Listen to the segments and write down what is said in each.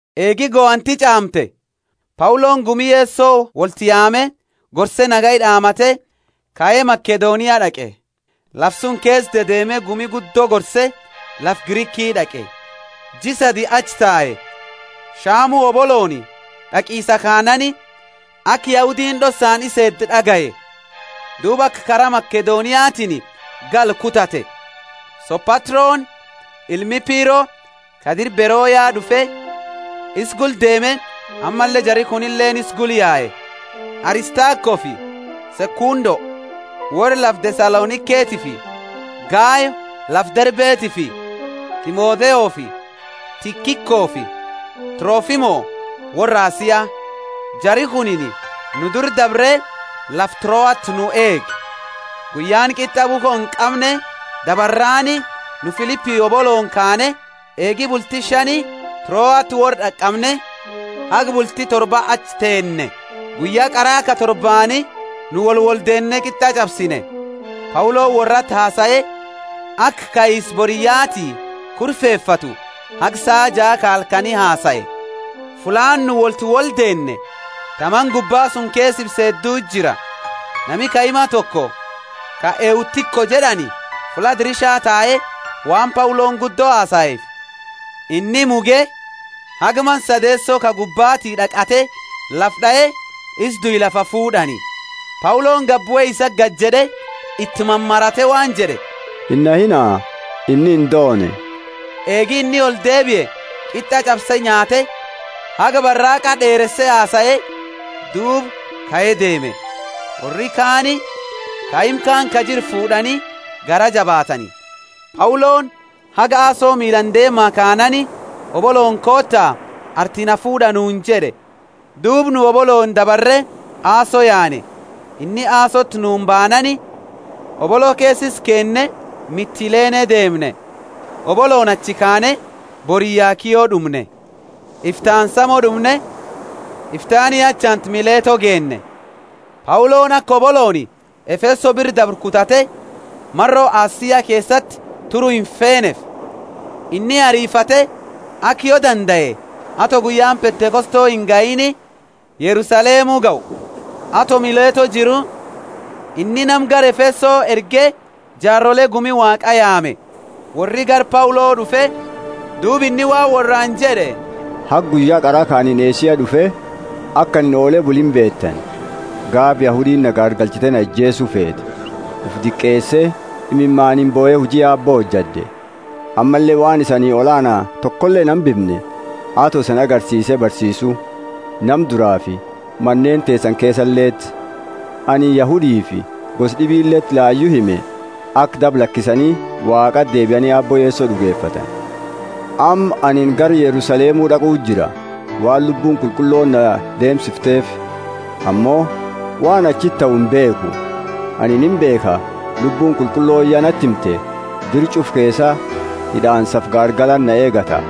Eegi gohanti ch'aamte, Pauloni gumi Yeso wolti yaame gorse nagaya d'aamate kae Makedonia d'aqe. Lafa suni keesa dedeeme gumi guddo gorse lafa Griki d'aqe. Jia sadii achi tae. Shamu hobolooni d'aqisa kaanaani, aka Yahudiini d'ossaani isa eedu d'agaye; duuba aka kara Makedoniatiini galu kutate. Sopatroni ilmi Piro ka dira Beroya d'ufe isa gula deeme ammalle jari kunileeni isa gula yae; Aristakofi Sekundo, worra lafa Thesaloniketifi Gayo lafa Derbetifi Timotheofi Tikikofi Trofimo, worra Asia. Jari kunini nu dura dabre lafa Troati nu eege. Guyyaani Qit'a bukho inqamne dabarraani nu Filipi hobolooni kaane, eegi bulti shani Troati worra d'aqamne, haga bulti torba achi teenne. Guyya qara ka torbaani nu woli woldeenne qit'a ch'absine. Pauloni worrati hasae, aka kaisa boriyyaati kurfefatu haga saa jaa ka halkani hasae. Fulla nu wolti woldeenne ta mana gubba suni keesa ifse hedduti jira. Nami kaima toko ka Eutiko jed'ani fulla dirisha tae; waan Pauloni guddo hasaeefi inni muge, haga mana sadeeso ka gubbati d'aqate lafa d'ae, isa due lafaa fuud'ani. Pauloni gadibue isati gadijed'e, iti mamarate waan jed'e, Inahiina, inni indoone. Eegi inni oldeebie qit'a ch'abse nyaate, haga baraaqa d'eereese hasae, duuba kae deeme. Worri kaani kaima kaani ka jiru fuud'ani garaa jabaatani. Pauloni haga Aso miilaani deemaa kanaani, Hobolooni koota arti na fuud'a nuuni jed'e, duuba nu hobolooni dabare Aso yaane. Inni Asoti nuuni baanaani, hobolo keesa isa keenne Mitilene deemne. Hobolooni achi kaane boriyya Kio d'umne. Iftaani Samo d'umne, iftaani achaantu Mileto geenne. Pauloni aka hobolooni Efeso biraa dabru kutate, maro Asia keesati turu imfeeneefi. Inni arifate aka yo dandae, ato guyyaani Pentekoste ingahiini Yerusalemu gahu. Ato Mileto jiru, inni nama gara Efeso erge jaarole gumi Waaqaa yaame. Worri gara Paulo d'ufe duuba inni waan worraani jed'e: Haga guyya qara ka anini Asia d'ufe, aka anini oole bule imbeetani. Gaafa Yahudiini na gaargalchite na ijeesu feete, ufi diqeese imimaani bohe huji Aabbo hojad'e. Ammalle waan isani olaana tokole inhambimne, ato isanii agarsiise barsiisu, nama duraafi maneeni teesani keesaleti. Anini Yahudifi gosa d'ibileti layu hime, aka daba lakisani Waaqati deebiani Aabbo Yeso d'ugefatani. Amma anini gara Yerusalemu d'aquu jira, waan Lubbuuni Qulqullooni na deemsifteefi; ammo waan achiti tahu imbeekhu. Anini imbeekha, Lubbuuni Qulqullooni ya nati himte, dira ch'ufa keesa hid'aansafi gaargalati na eegata.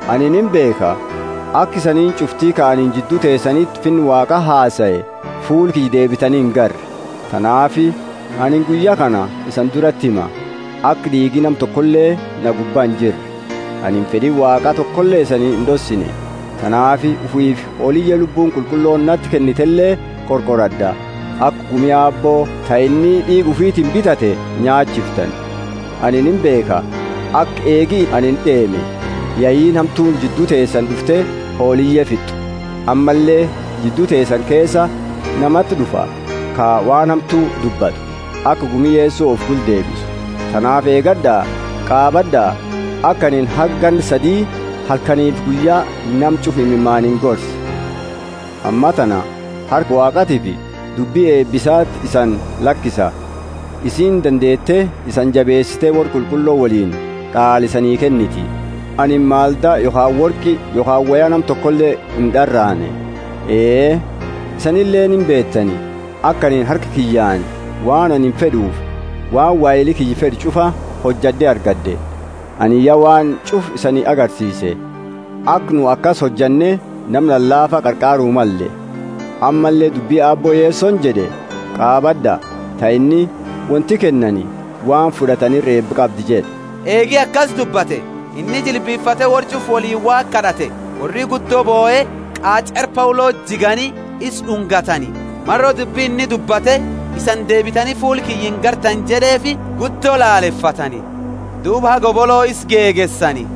Anini imbeekha, aka isaaniini ch'ufti, ka anini jiddu teesaniti Finna Waaqa hasae, fuula kiyya deebitani ingarre. Tanaafi anini guyya kana isani durati hima, aka d'iigi nama tokoleeni na gubbaa injirre. Anini fed'i Waaqa tokole isani ind'ossine. Tanaafi ufiifi hooliye Lubbuuni Qulqullooni isaniti kennitele qorqorad'a, aka gumi Aabbo ta inni d'iiga ufitiini bitate nyaachiftani. Anini imbeekha aka eegi anini deeme, yeyiini hamtuuni jiddu teesani d'ufte hooliye fit'u. Ammalle jiddu teesani keesa namati d'ufa, ka waan hamtu dubbatu, aka gumi Yeso ufi gula deebisu. Tanaafi eegad'a, qaabad'a, aka anini haga ganna sadi halkaniifi guyya nama ch'ufa imimaaniini gorse. Ammatana harka Waaqatiifi dubbi eeba isaati isani lakisa. Isiini dandeete isani jabeesite worra qulqullo woliini d'aala isani kenniti. Anini maldaa yokhaani worqi yokhaani woya nama tokole ind'araane. Ee, isanileeni imbeetani, aka anini harka kiyyaani waan anini fed'ufi waan waheli kiyya fed'u ch'ufa hojad'e argad'e. Anini ya waan ch'ufa isani agarsiise, aka nu akasi hojanne nama lalaafa qarqaaru malle. Ammalle dubbi Aabbo Yesoni jed'e qaabad'a, ta inni, Wonti kennani waan fud'atani ira eeba qabdi jed'e. Eegi akasi dubbate, inni jilbifate worra ch'ufa woliini Waaqa kad'ate. Worri guddo bohe qach'eera Pauloti jigani isa d'ungatani. Maro dubbi inni dubbate, Isani deebitani fuula kiyya inargitani jed'eefi guddo lalefatani. Duuba haga hobolo isa gegeesani.